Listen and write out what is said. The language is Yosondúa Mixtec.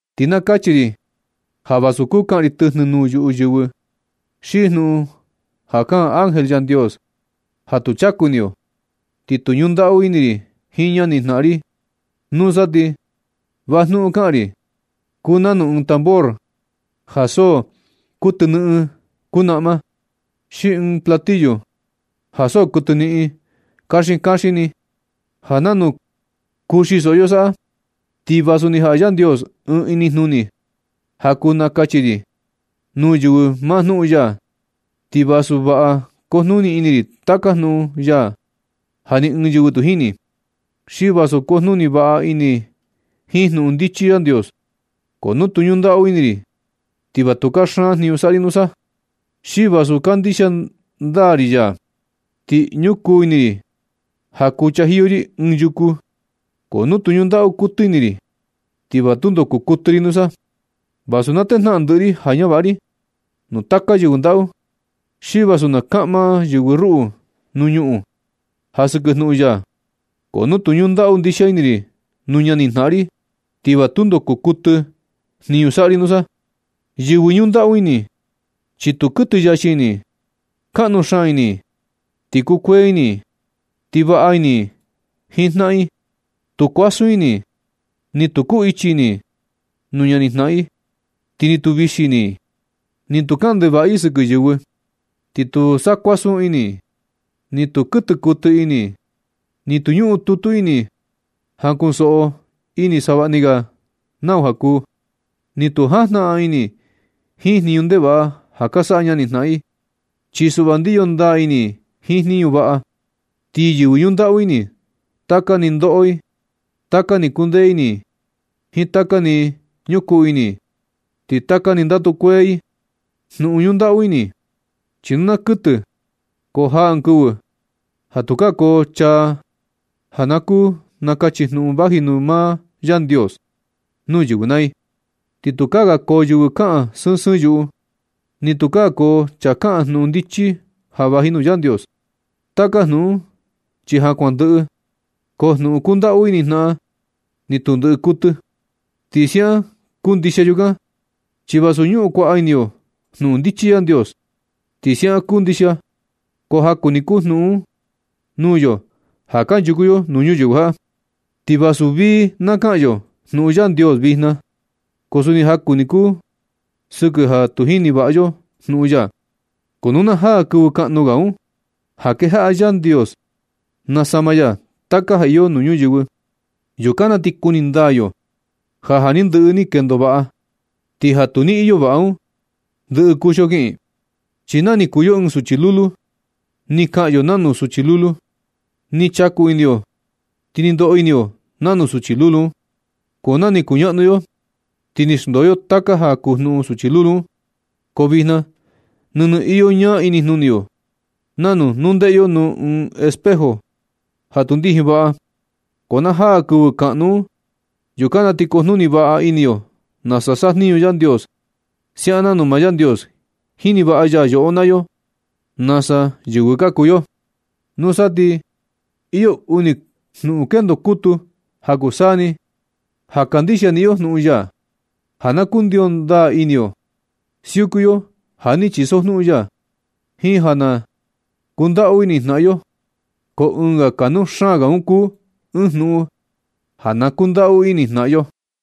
Ti na kachi ri ja vasu kuu kaꞌan ri tɨjnɨ nuu yuꞌu yɨvɨ, xi jnuꞌun ja kaꞌan ángel Yandios ja tu chaku ini yo, ti nu tu ñundaꞌu ini ri jiin jnaꞌan ri, nusa ti va jnuꞌun kaꞌa ri kuunanu ɨɨn tambor ja so kuɨtɨnɨꞌɨn kunaꞌma, xi ɨɨn platillo ja so kuɨtɨnɨꞌɨn kaxin kaxin ni, ja nanu kuxi soꞌo yo saꞌa. Ti vasu ni jaꞌa Yandios ɨɨn inijnuni ja kuu nakachi ri nuu yɨvɨ maa jnuꞌun ya, ti vasu vaꞌa na kujnuni ini ri taka jnuꞌun ya ja ni ɨɨn yɨvɨ tu jini, xi vasu kujnuni vaꞌa ini jiin jnuꞌun ndichi Yandios, ko nu tu ñundaꞌu ini ri, ti va tu kaxan jniñu saꞌa ri nusa. Xi vasu kandixia ndaa ri ya, ti ñukuu ni ini ri ja kuu chajiyo ri ɨɨn yuku, ko nu tu ñundaꞌu kuɨtɨ ini ri, ti va tundo kuu kuɨtɨ ri nusa. Vasu na tejnaꞌan ndɨꞌɨ ri ja ñavaꞌa ri nuu taka yɨvɨ ndaꞌu, xi vasu na kaꞌma yɨvɨ ruꞌu nuu ñuꞌun ja sɨkɨ jnuꞌun ya, ko nu tu ñundaꞌu ndixia ini ri nuu ñanijnaꞌan ri, ti va tundo kuu kuɨtɨ jniñu saꞌa ri nusa. Yɨvɨ ñundaꞌu ini, chi tu kuɨtɨ yachi ini i. Kaꞌnu xaan ini i, ti kuee ini i, ti vaꞌa ini i jiin jnaꞌan i. Tu kuasun ini i, ni tu kuu ichi ini i nuu ñanijnaꞌan i, ti ni tu vixi ini i. Ni tu kaꞌan ndevaꞌa i sɨkɨ yɨvɨ, ni tu sa kuasun ini, ni tu kuɨtɨ kuɨtɨ ini, ni tu ñuꞌun tutu ini i ja kuꞌun koso ini i savaꞌni ga nau ja kuu. Ni tu jajnaꞌan ini i jiin jniñu ndevaꞌa ja ka saꞌa ñani jnaꞌan i. Chi suꞌva ndiyo ndaa ini i jiin jniñu vaꞌa. Ti yɨvɨ ñundaꞌu ini, taka ni ndoꞌo i, taka ni kundee ini i jiin taka ni ñukuu ini i, ti taka ni ndatu kuee i. Jnuꞌun ñundaꞌu ini, chi tu naa kuɨtɨ, ko jaa ɨɨn kɨvɨ ja tukaa koo chaa ja kuu nakachi jnuꞌun vaji nuu maa Yandios nuu yɨvɨ naa i, ni tukaa ga koo yɨvɨ kaꞌan sɨɨn sɨɨn yuꞌu, ni tukaa koo chaa kaꞌan jnuꞌun ndichi ja vaji nuu Yandios. Taka jnuꞌun un chi ja kuan ndɨꞌɨ, ko jnuꞌun kundaꞌu ini jnaꞌan, ni tu ndɨꞌɨ kuɨtɨ. Ti siaꞌan kuu ndixia yukan, chi vasu ñuꞌun kuaꞌa ini yo jnuꞌun ndichi Yandios, ti siaꞌan kuu ndixia, ko jaku ni kuu jnuꞌun un nuu yo ja kanchuku yo nuu ñuyɨvɨ jaꞌa. Ti vasu vii na kaꞌan yo jnuꞌun Yandios vijna, ko suni jaku ni kuu sɨkɨ ja tu jini vaꞌa yo jnuꞌun ya. Ko nu na jaa kɨvɨ kaꞌnu ga un, ja kejaꞌa Yandios nasama ya taka ja iyo nuu ñuyɨvɨ, yukan na ti kuni ndaa yo ja ja ni ndɨꞌɨ ni kendo vaꞌa, ti ja tu ni iyo vaꞌa un, ndɨꞌɨ kuxio kiꞌin. Chi na ni kuu yo ɨɨn suchi lulu, ni kaꞌan yo nanu suchi lulu, ni chaku ini yo, ti ni ndoꞌo ini yo nanu suchi lulu un. Ko nu ni ka kuñaꞌnu yo, ti ni xndoo yo taka ja kuu jnuꞌun suchi lulu un. Ko vijna nɨnɨ iyo ñaa inijnuni yo nanu nu ndeꞌe yo nuu ɨɨn espejo ja tu ndijin vaꞌa. Ko na jaa kɨvɨ kaꞌnu un, yukan na ti kujnuni vaꞌa ini yo nasa sajniñu Yandios, siaꞌan nanu maa Yandios jini vaꞌa ya yoꞌo naa yo nasa yɨvɨ ka kuu yo. Nusa ti iyo uni jnuꞌun kendo kutu ja kuu saa ni ja kuu saa ni: ja kandixia niꞌin yo jnuꞌun ya, ja na kundio ndaa ini yo siuku yo ja ni chisojnuꞌun ya, jiin ja na kundaꞌu ini jnaꞌan yo. Ko ɨɨn ja kanuu xaan ga un kuu ɨɨn jnuꞌun ja na kundaꞌu ini jnaꞌan yo.